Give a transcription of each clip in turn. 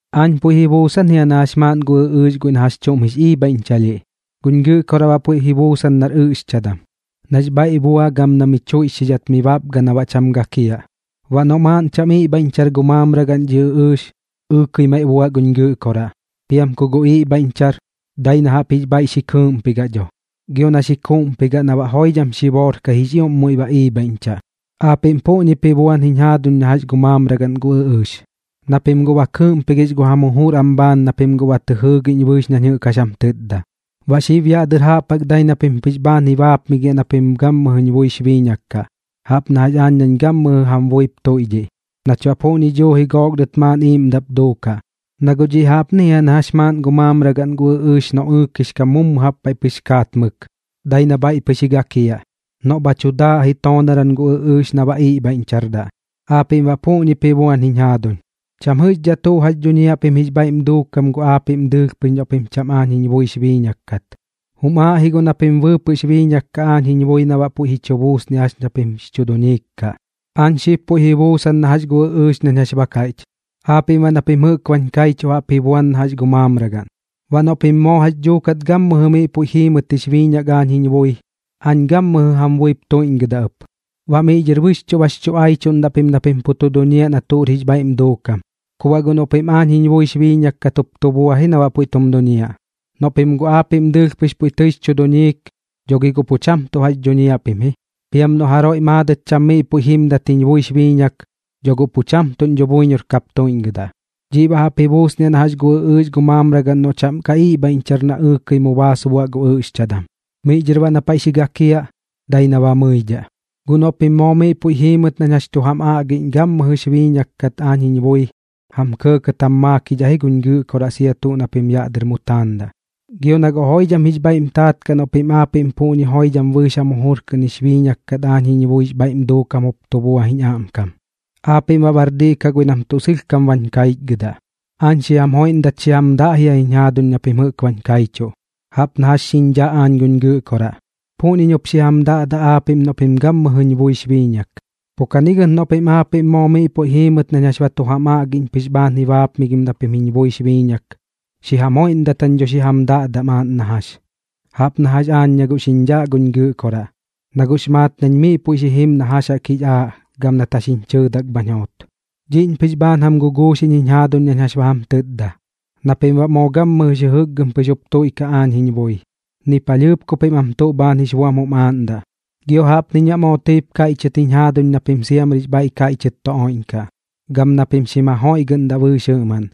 ’Aañ puiꞌ ji buusan jia na jax maaꞌn gu ɨꞌɨɨx guiꞌ na jax chuꞌm jix iibhaiꞌñchalhiꞌ, guñ Gɨꞌkoraꞌ baꞌ puiꞌp ji buusan nar ɨꞌxchadam, nax bhaiꞌ bua gam na mi chuiꞌchxidhat mi bapga na baꞌ cham gakiaꞌ. Baꞌ noꞌ maaꞌn cham iꞌbhaiꞌñchar gu mamragaꞌn dhi ɨꞌɨɨx, ɨɨkɨi maiꞌ buaꞌ guñ Gɨꞌkoraꞌ. Piam ku guꞌ iꞌbhaiꞌñchar, dai na jaꞌp jix bhaiꞌ xi kɨɨꞌmpigaꞌ dho, gio na xi kuuꞌmpigaꞌ na baꞌ joidham xiboorkai jix ioꞌm muiꞌ ba iibhaiꞌñchaꞌ. Aapiꞌm puꞌñip ji buan jiñ jaaduñ na jax gu mamragaꞌn gu ɨꞌɨɨx, na pim guꞌ ba kɨɨꞌmpigix gu jam jujur am bhaan na pim ba tɨ jɨɨgiꞌñ bɨɨx nañ jɨꞌk jax jam tɨtda. Baꞌ xib yaꞌ dɨr jaꞌp jaꞌk dai na pim pɨx bhaan ji baapmigiaꞌ na pim gammɨjɨñ buix biiñak kaꞌ, jaꞌp na jax aañ nañ gammɨjɨ jam buip tuiꞌdhiꞌ, nach baꞌ puꞌñi duuji gook dɨt maaꞌn iiꞌmdaꞌp duukaꞌ. Na guꞌ dhiꞌ jaꞌpni jia na jax maaꞌn gu mamragaꞌn gu ɨꞌɨɨx noꞌ ɨɨkix kam mummu jaꞌp paiꞌ pɨx kaat mɨk, dai na bhaiꞌ pɨx ji gakiaꞌ. Noꞌ bha chu daaꞌ ji toonaram gu ɨꞌɨɨx na baꞌ iꞌbhaiꞌñchardaꞌ. Aapiꞌm baꞌ puꞌñip ji buan jiñ jaaduñ, cham jɨꞌxdhaꞌ tuꞌ jax dhuñiaꞌ pim jix bhaiꞌm duukam gu aapiꞌm dɨɨlh pɨx noꞌ pim cham aañ jiñ buix biiñak kat. Jum aaꞌndaꞌ ji guꞌ na pim bɨɨpɨꞌx biiñak kaꞌ aañ jiñ bui na baꞌ puiꞌ ji chu buusnidhaꞌ jax ña pim jix chu duñiik kaꞌ. ’Aañ xib puiꞌ ji buusan na jax gu ɨꞌɨɨx nañ jax ba kaiꞌch, aapiꞌm baꞌ na pim jɨꞌk bañ kaichuꞌ jaꞌp ji buan na gu mamragaꞌn. Baꞌ noꞌ pim moo jax dhuuk gammɨjɨ miꞌ puiꞌ jiimɨt jix biiñak aañ jiñ bui, aañ gammɨjɨ jam buip tuiꞌñgɨdaꞌ ɨp. Baꞌ miꞌ dhɨr bɨxchuꞌ bax chu aichuꞌndaꞌ pim na pim pu tu duñiaꞌ na tuꞌr jix bhaiꞌm duukam, ku baꞌ guꞌ noꞌ pim aañ jiñ buix biiñak kat jup tu bua ji na baꞌ puiꞌ tum duñiaꞌ. Noꞌ pim guꞌ aapiꞌm dɨɨlh pɨx puiꞌ tɨix chu duñiik, dho gi guꞌ pu cham tuꞌ jax dhuñiaꞌ pim ji. Piam noꞌ guꞌ jaroiꞌ maadɨt cham miꞌ puiꞌ jimdat jiñ buix biiñak, dho guꞌ pu cham tuꞌñ dho buiñor kap tuiꞌñgɨdaꞌ. Dhiꞌ baꞌ jaꞌp ji buusniaꞌ na jax gu ɨꞌɨɨx gu mamragaꞌn noꞌ cham ka iꞌbhaiꞌñchar na ɨɨkɨi mu baas buaꞌ gu ɨꞌxchadam. Miꞌ dhɨr na paiꞌ xi gakiaꞌ, dai na ba mɨidhaꞌ. ’Guꞌ noꞌ pim moo miꞌ puiꞌ jiimɨt nañ jax tu jam aꞌgiꞌñ gammɨjɨx biiñak kat aañ jiñ bui, jam kɇɇkɇt jam maakidhaꞌ ji guñ Gɨꞌkoraꞌ sia tuꞌ na pim yaꞌ dɨr mu taandaꞌ. Gio na guꞌ joidham jix bhaiꞌm taat kaꞌ noꞌ pim aapiꞌm puꞌñi joidham bɨɨx jam jujur kɨꞌn jix biiñak kat aañ jiñ buix bhaiꞌm duukam jup tu bua jiñ aꞌmkam, aapiꞌm baꞌ bar diꞌ kaꞌ guiꞌ nam tuꞌ sɨlhkam bañ kaiꞌchgɨdaꞌ. Aañ xi jam joiꞌndat xi jam daꞌ jia jiñ jaaduñ na pim jɨꞌk bañ kaichuꞌ. Jaꞌp na jax xiñ dhaꞌ aañ guñ Gɨꞌkoraꞌ, puꞌñiñ jup xi jam daꞌdaꞌ aapiꞌm noꞌ pim gammɨjɨñ buix biiñak. Pu kani gɨt noꞌ pim aapiꞌm moo miꞌ puiꞌ jiimɨt nañ jax ba tu jam aꞌgiꞌñ pɨx bhaan ji baapmigim na pim jiñ buix biiñak, xi jam joiꞌndat jañ dho xi jam daꞌdaꞌ maaꞌn na jax, jaꞌp na jax aañ na guꞌ xiñ dhaꞌ guñ Gɨꞌkoraꞌ, na guꞌx maat nañ miꞌ puiꞌ xi jim na jax jaꞌk jix aaꞌ gam nat jax jiñ chɨɨdak bhañ joot. ’Dhiꞌñ pɨx bhaan jam guguuxiꞌñ jiñ jaaduñ nañ jax ba jam tɨtda, na pim baꞌ moo gammɨjɨx jɨjɨkgɨm pɨx jup tuiꞌkaꞌ aañ jiñ bui, ni palhɨɨp ku pim am tuꞌ bhaan jix buam jum aaꞌndaꞌ. Gio jaꞌpniñ baꞌ moo tɨip kaiꞌchɨt jiñ jaaduñ na pim siamrix bhaiꞌ kaiꞌchɨt tu oiꞌñkaꞌ, gam na pim xim jajoiꞌgɨꞌndaꞌ bɨɨx jɨꞌmaꞌn,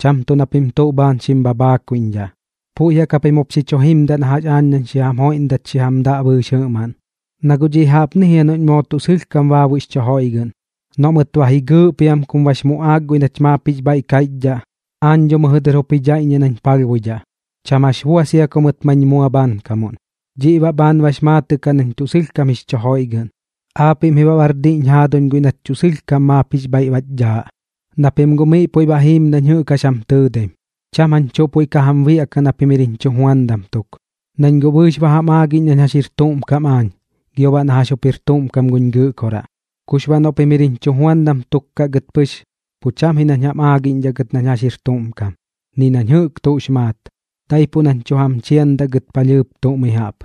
cham tuꞌ na pim tuꞌ bhaan xim bhabhaakuiꞌñdhaꞌ. Puiꞌ jaꞌk japim jup xi chu jimdaꞌ na jax aañ nañ xi jam joiꞌndat xi jam daꞌ bɨɨx jɨꞌmaꞌn. Na guꞌ dhiꞌ jaꞌpni jia noꞌñ moo tuꞌ sɨlhkam baabuiꞌx chu joiꞌgɨꞌn, noꞌ mɨt ba ji gɨɨꞌ piam kum bax muꞌaak guiꞌ nach maap jix bhaiꞌ kaiꞌchdhaꞌ, aañ dho mɨjɨ dɨr jup ji dhaiꞌññiaꞌ nañ palhbuidhaꞌ, cham jax bua sia ku mɨt mañ mua bhaankamuꞌn. Dhiꞌ baꞌ bhaan bax maatɨꞌ kaꞌ nañ tuꞌ sɨlhkam jix chu joiꞌgɨꞌn. Aapiꞌm ji baꞌ bar dhiꞌñ jaaduñ guiꞌ nach tuꞌ sɨlhkam maap jix bhaiꞌ bach dhaaꞌ, na pim guꞌ miꞌ puiꞌ ba jiim nañ jɨꞌk jax jam tɨɨdaim. Cham jañ tuꞌ puiꞌ ka jam biaꞌkaꞌ na pim jir jiñ chujuandam tuk, nañ guꞌ bɨɨx ba jam aagiꞌñ nañ jax jir tuꞌm kam aañ gio baꞌ na jax jir tuꞌm kam guñ Gɨꞌkoraꞌ. Kux baꞌ noꞌ pim jir jiñ chujuandam tuk kaꞌ gɨt pɨx, pu cham ji nañ jam aagiꞌñdhaꞌ gɨt nañ jax jir tuꞌm kam, ni nañ jɨꞌk tuꞌx maat, daipuꞌ nañ tuꞌ jam chiandaꞌ gɨt palhɨɨp tuꞌ mi jaꞌp,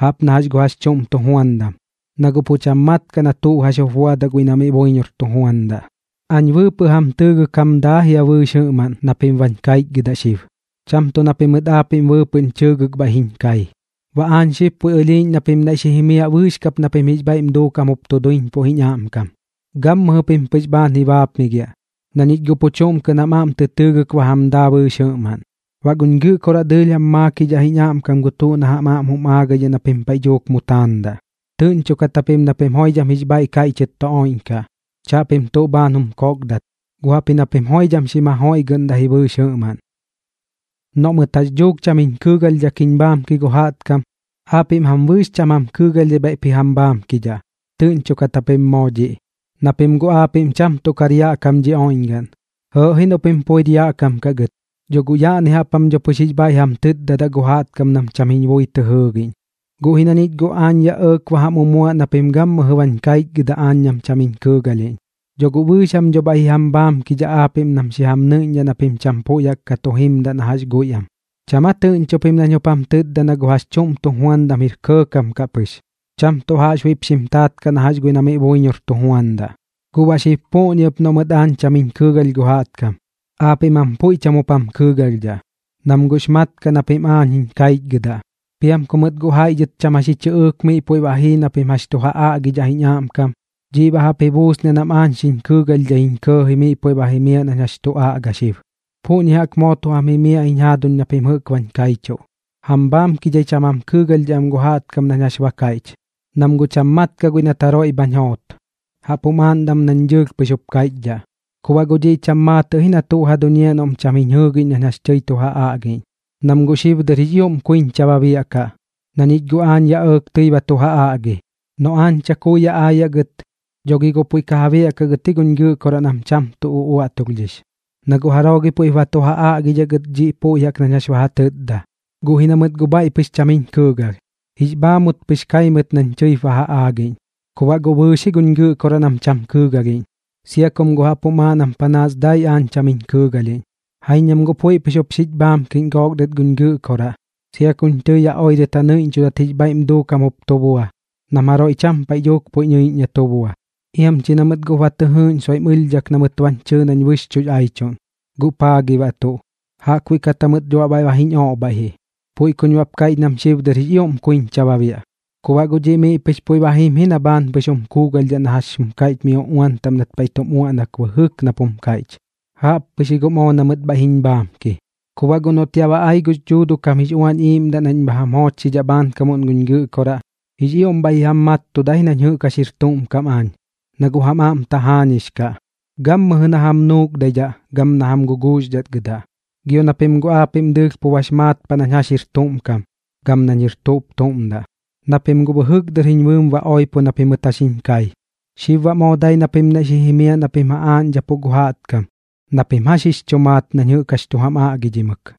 jaꞌp na jax gu jax chuꞌm tujuandam, na guꞌ pu cham mat kaꞌ na tuꞌ jax jup buadaꞌ guiꞌ na miꞌ buiñor tu juandaꞌ. Aañ bɨɨpɨꞌ jam tɨɨgɨk jam daa jia bɨɨx jɨꞌmaꞌn na pim bañ kaichgɨdaꞌ xib, cham tuꞌ na pimɨt aapiꞌm bɨɨpɨꞌñ chɨɨgɨk bhaiꞌ jiñ kai. Baꞌ aañ xib puiꞌ ɨlhiiꞌñ na pim naiꞌ xi jimiaꞌ bɨɨx kap na pim jix bhaiꞌm duukam jup tu duiñpuꞌ jiñ aꞌmkam. Gammɨjɨ pim pɨx bhaan ji baapmigiaꞌ, na ñich guꞌ pu chuꞌm kɨꞌn jam aꞌm tɨ tɨɨgɨk ba jam daa bɨɨx jɨꞌmaꞌn. Baꞌ guñ Gɨꞌkoraꞌ dɨɨlh jam maakidhaꞌ jiñ aꞌmkam gu tuꞌ na jam aꞌm jum aagaidhaꞌ na pim paiꞌ dhuuk mu taandaꞌ. Tɨꞌñchokat japim na pim joidham jix bhaiꞌ kaiꞌchɨt tu oiꞌñkaꞌ, chaꞌpim tuꞌ bhaan jum kokdat, guꞌ jaꞌpji na pim joidham xim jajoiꞌgɨꞌndaꞌ ji bɨɨx jɨꞌmaꞌn. ’Noꞌ mɨt jax dhuuk cham jiñ kɨɨgalhdhak jiñ bhaamki gu jaꞌtkam, aapiꞌm jam bɨɨx cham jam kɨɨgalhdhai bhaiꞌp ji jam bhaamkidhaꞌ. Tɨꞌñchokat japim moo dhiꞌ. Na pim guꞌ aapiꞌm cham tuꞌ kar yaꞌ kam dhi oiꞌñgaꞌn. Jɨɨꞌ ji noꞌ pim puir yaꞌ kam kaꞌ gɨt, dho guꞌ yaꞌni jaꞌp jam dho pɨx jix bhaiꞌ jam tɨtdadaꞌ gu jaꞌtkam nam cham jiñ bui tɨ jɨɨgiꞌñ. Guꞌ ji na ñich guꞌ aañ yaꞌ ɇɇk ba jam umuaꞌ na pim jɨꞌk gammɨjɨ bañ kaichgɨdaꞌ aañ nam cham jiñ kɨɨgalhiꞌñ. Dhoꞌ guꞌ bɨɨx jam dho baꞌ bhaiꞌ ji jam bhaamkidhaꞌ aapiꞌm nam xi jam nɨiꞌñdhaꞌ na pim cham puiꞌ jaꞌk ka tu jimdaꞌ na jax guiꞌ am. ¿Cham aa guꞌ tɨꞌñcho pim nañ jup jam tɨtda na gu jax chuꞌm tujuandam jir kɇɇkam kaꞌ pɨx, cham tuꞌ jaꞌxbuiꞌp xim taat kaꞌ na jax guiꞌ na miꞌ buiñor tu juandaꞌ? Guꞌ baꞌ xib puꞌñi ɨp noꞌ mɨt aañ cham jiñ kɨɨgalh gu jaꞌtkam, aapiꞌm jam puiꞌ cham jup jam kɨɨgalhdhaꞌ, nam guꞌx mat kaꞌ na pim aañ jiñ kaichgɨdaꞌ. Piam ku mɨt guꞌ jaiꞌ dhɨt cham jax ji chɨꞌɨɨk miꞌ puiꞌ ba jii na pim jax tu ja aꞌgidhaꞌ jiñ aꞌmkam, dhiꞌ baꞌ jaꞌp ji buusniaꞌ nam aañ xiñ kɨɨgalhdhaiñ kɇɇji miꞌ puiꞌ ba jimaꞌ nañ jax tu aꞌga xib. Puꞌñi jaꞌk moo tu jam jimiaꞌ jiñ jaaduñ na pim jɨꞌk bañ kaichuꞌ, jam bhaamkidhai cham jam kɨɨgalhdhaꞌ am gu jaꞌtkam nañ jax ba kaiꞌch, nam guꞌ cham mat kaꞌ guiꞌ nat jaroiꞌ bhañ joot. Jaꞌp jum aaꞌndaꞌ am nañ dɨɨlh pɨx jup kaiꞌchdhaꞌ. ’Ku baꞌ guꞌ dhiꞌ cham maatɨꞌ ji na tuꞌ ja duñiaꞌ noꞌm cham jiñ jɨɨgiꞌñ nañ jax tɨi tu ja aꞌgiꞌñ, nam guꞌ xib dɨr jix ioꞌm kuiñcha ba biaꞌkaꞌ, na ñich guꞌ aañ yaꞌ ɇɇk tɨi ba tu ja aꞌgi. Noꞌ aañ chakui yaꞌ aayaꞌ gɨt, dho gi guꞌ puiꞌ ja biaꞌkaꞌ gɨt guñ Gɨꞌkoraꞌ nam cham uꞌuaꞌtulhdhix, na guꞌ jaroo gi puiꞌp ba tu ja aꞌgidhaꞌ gɨt dhiꞌ puiꞌ jaꞌk nañ jax ba ja tɨtda. Guꞌ ji na mɨt guꞌ bhaiꞌ pɨx cham jiñ kɨɨgalh, jix bhaamut pɨx kai mɨt nañ tɨip ba ja aagiꞌñ. Ku baꞌ guꞌ bɨɨx ji guñ Gɨꞌkoraꞌ nam cham kɨɨgalhiꞌñ, sia kum guꞌ jaꞌp jum aaꞌ nam panaas dai aañ cham jiñ kɨɨgalhiꞌñ. Jaiñ nam guꞌ puiꞌ pɨx jup xich bhaamkiꞌñ gook dɨt guñ Gɨꞌkoraꞌ, sia kuñ tɨi yaꞌ oirɨt ja nɨiꞌñchudat jix bhaiꞌm duukam jup tu bua nam jaroiꞌ cham paiꞌ dhuuk puiꞌ nɨiꞌñ na tu bua. Iam chi na mɨt guꞌp ba tɨ jɨɨꞌñ soiꞌm ɨlhdhak na mɨt bañ chɨɨ nañ bɨxchuꞌx aichuꞌn. ¿Guꞌ paa gi baꞌ tuꞌ? Jaꞌkbuiꞌ kat jamɨt dho baꞌ bhaiꞌ ba jiñ oꞌbhaiꞌ ji. Puiꞌ kuñ baꞌp kaiꞌch nam xib dɨr jix ioꞌm kuiñcha ba biaꞌ. Ku baꞌ guꞌ dhiꞌ miꞌ pɨx puiꞌ ba jim ji na bhaan pɨx jum kuugalhdhaꞌ na jax jum kaiꞌch mi uꞌuan taꞌm nat paiꞌ tum uaꞌnak bɨjɨk nap jum kaiꞌch: “Jaꞌp pɨx ji guꞌ moo na mɨt bhaiꞌ jiñ bhaamki.” ’Ku baꞌ guꞌ noꞌt yaꞌ ba ai gux Dhuuduꞌ kam jix Uañ Iiꞌmdaꞌ nañ bha jam joochxidhaꞌ bhaankamuꞌn guñ Gɨꞌkoraꞌ, jix ioꞌm bhaiꞌ ji jam mattudaꞌ ji nañ jɨꞌk jax jir tuꞌm kam aañ, na guꞌ jam aꞌm tajaañix kaꞌ, gammɨjɨ na jam nuukdaidhaꞌ gam na jam guguuxdhatgɨdaꞌ. Gio na pim guꞌ aapiꞌm dɨɨlh pu bax maat paꞌ nañ jax jir tuꞌm kam gam nañ jir tuꞌp tuꞌm daꞌ, na pim guꞌ bɨjɨk dɨr jiñ bɨɨm ba oipo na pimɨt jax jiñ kai. Xib baꞌ moo dai na pim naiꞌ xi jimiaꞌ na pim ja aaꞌñdhapuꞌ gu jaꞌtkam na pim jax jix chu maat nañ jɨꞌk jax tu jam aꞌgidhimɨk.